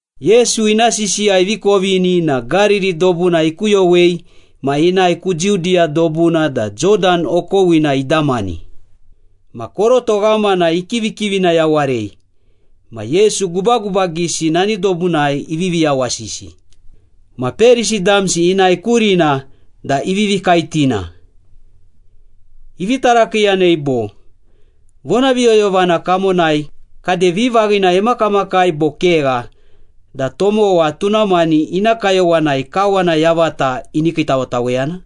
Yesu ina sisiya ivi kovini na Gariri dobuna ikuyowei ma inae ku Judiya dobuna da Jodan okowina idamani. Ma koroto ghamana ikivikivina yawarei, ma Yesu gubagubagisi nani dobunai ivivi yawasisi. Ma Perisi damsi inae kurina da ivivi kaetina. Ivi tarakiiyanei bo, “Vonaviyoyovana kamonai kade vivaghina emakamakai bo kegha da tomowa tuna mani ina kayowanai kawana yavata ini kiitawetaweyana?”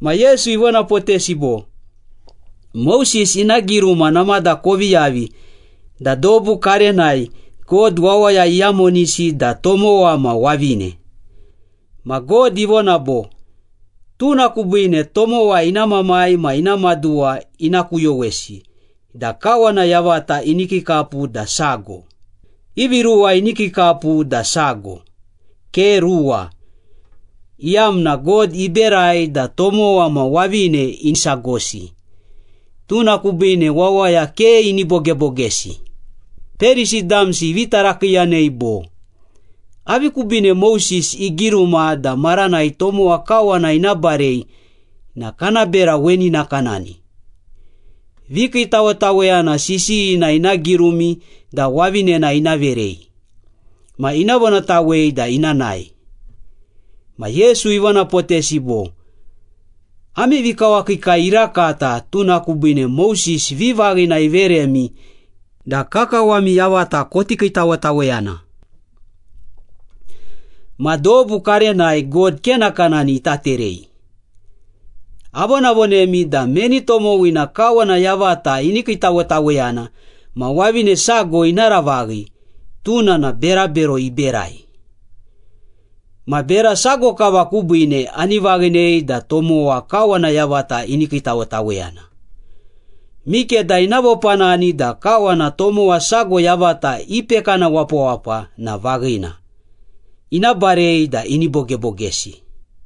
Ma Yesu ivonapotesi bo, “Moses ina giruma namada kovi yavi da dobu karenai God ‘wawaya iyamonisi da tomowa ma wavine.’ Ma God ivona bo, ‘Tuna kubiine tomowa ina mamai ma ina maduwa ina kuyowesi da kawana yavata ini kiikapu da sago.’ Ivi ruwa ini kiikapu da sago, ke ruwa, iyamna God iberai da tomowa ma wavine isagosi, tuna kubiine wawaya ke ini bogebogesi.” Perisi damsi ivi tarakiiyanei bo, “Avi kubiine Moses igiruma da, ‘Maranai tomowa kawana ina barei na kana bera weni nakanani. Vikiitawetaweyana sisiyina ina girumi da wavinena ina verei. Ma ina vonatawei da ina nae.’” Ma Yesu ivonapotesi bo, “Ami vikawakiikai irakata, tuna kubiine Moses vivaghina iveremi da kakawami yavata koti kiitawetaweyana. Ma dobu karenai God ke nakanani ita terei. Avonavonemi da meni tomowina kawana yavata ini kiitawetaweyana ma wavine sago ina ravaghi, tuna na berabero iberai. Ma bera sago kava kubiine ani vaghinei da tomowa kawana yavata ini kiitawetaweyana. Mikeda ina vopanani da kawana tomowa sago yavata ipekana wapawapa na vaghina, ina barei da ini bogebogesi.”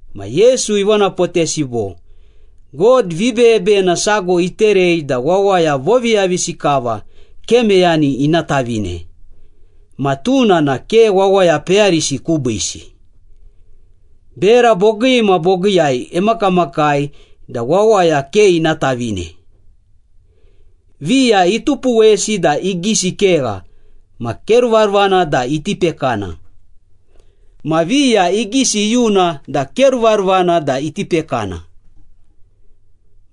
Ma Yesu ivonapotesi bo, “God vibeyebeyena sago iterei da wawaya voviyavisi kava ke meyani ina tavine, ma tuna na ke wawaya peyarisi kubiisi. Bera bogii ma bogiiyai emakamakai da wawaya ke ina tavine. Viya itupuwesi da igisi kegha ma ke ruvaruvana da iti pekana. Ma viya igisi iyuna da ke ruvaruvana da iti pekana.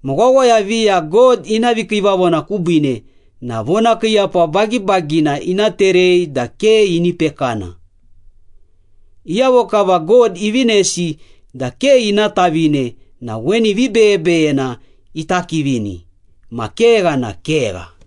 Ma wawaya viya God ina vikiivavona kubiine na vonakiiyapa bagibagina ina terei da ke ini pekana. Iyavo kava God ivinesi da ke ina tavine na weni vibeyebeyena ita kivini. Ma kegha na kegha.”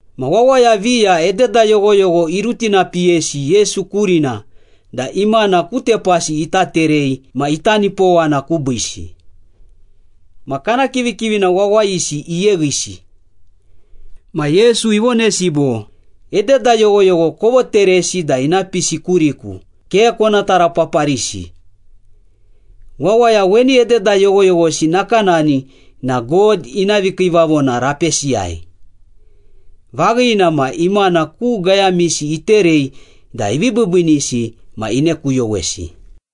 Ma wawaya viya ededa yoghoyogho irutinapiyesi Yesu kurina da imana ku tepasi ita terei ma ita nipowana kubiisi. Ma kana kivikivina wawayisi iyeghisi. Ma Yesu ivonesi bo, “Ededa yoghoyogho kovoteresi da ina pisi kuriku, ke kona tarapaparisi. Wawaya weni ededa yoghoyoghosi nakanani na God ina vikiivavona rapesiyai.” Vaghina ma, imana ku gayamisi iterei da ivi biibiinisi ma inekuyowesi.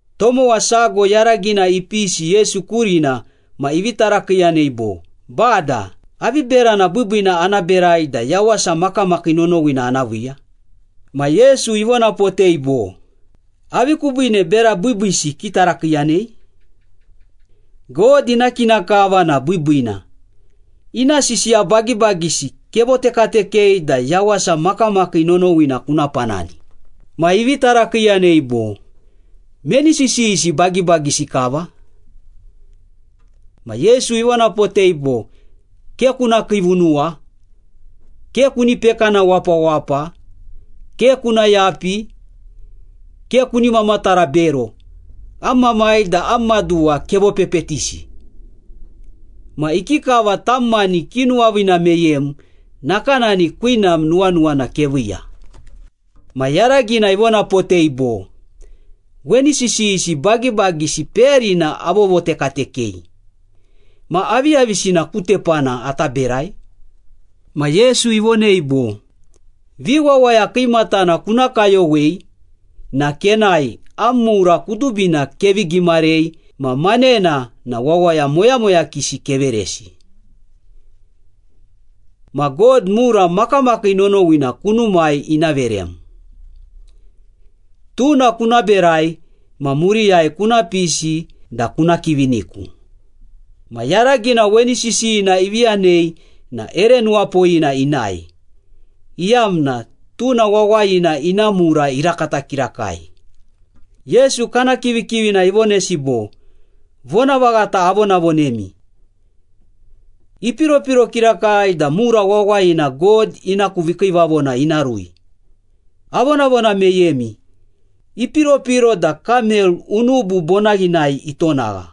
Tomowa sago yaragina ipisi Yesu kurina ma ivi tarakiiyanei bo, “Bada, avi berana biibiina ana berai da yawasa makamakii nonowina ana viiya?” Ma Yesu ivonapotei bo, “Avi kubiine bera biibiisi kitarakiiyanei? God ina kina kava na biibiina. Ina sisiya bagibagisi kevotekatekei da yawasa makamakii nonowina kuna panani.” Ma ivi tarakiiyanei bo, “Meni sisiyisi bagibagisi kava?” Ma Yesu ivonapotei bo, “Ke kuna kiivunuwa, ke kuni pekana wapawapa, ke kuna yapi, ke kuni mamatara bero, am mamai da am maduwa kevopepetisi, ma ikikava tam mani kinuwaviina meyem, nakanani kwinam nuwanuwana keviiya.” Ma yaragina ivonapotei bo, “Weni sisiyisi bagibagisi peyarina avovotekatekei. Ma aviyavisina ku tepana ata berai?” Ma Yesu ivonei bo, “Viwawaya kiimatana kuna kayowei na kenae, am mura kudubina kevi gimarei ma manena na wawaya moyamoyakisi keveresi. Ma God mura makamakii nonowina kunumai ina verem. Tuna kuna berai, ma muriyai kuna pisi da kuna kiviniku.” Ma yaragina weni sisiyina ivi yanei na ere nuwapoyina inae, iyamna tuna wawayina ina mura irakata kirakai. Yesu kana kivikivina ivonesi bo, “Vonavaghata avonavonemi. Ipiropiro kirakai da mura wawayina God ina ku vikiivavona ina rui. Avonavona meyemi, ipiropiro da kamel unubu bonaghinai itonagha,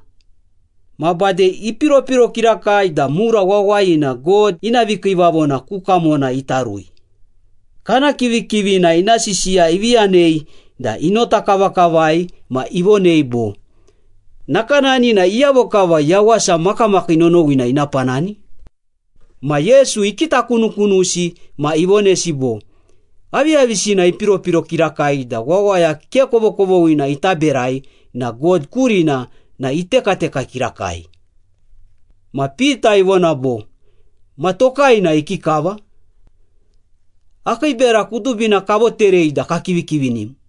ma bade ipiropiro kirakai da mura wawayina God ina vikiivavona ku kamona ita rui.” Kana kivikivina ina sisiya ivi yanei da inota kavakavai ma ivonei bo, “Nakanani na iyavo kava yawasa makamakii nonowina ina panani?” Ma Yesu ikitakunukunusi ma ivonesi bo, “Aviyavisina ipiropiro kirakai da wawaya ke kovokovoghina ita berai na God kurina na itekateka kirakai.” Ma Pita ivona bo, “Ma tokai na ikikava? Akii bera kudubina kavoterei da kakivikivinim.”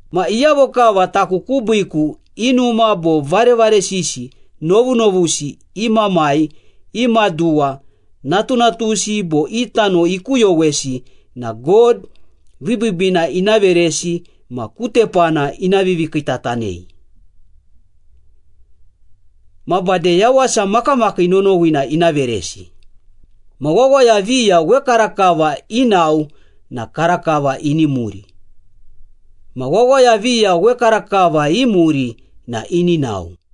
Ma iyavo kava taku kubiiku i numa bo varevaresisi, novunovusi, i mamai, i maduwa, natunatusi bo i tano ikuyowesi na God vibiibiina ina veresi ma ku tepana ina vivikiitatanei. Ma bade yawasa makamakii nonowina ina veresi. Ma wawaya viya wekarakava inao na karakava ini muri. Ma wawaya viya wekarakava imuri na ini nao.”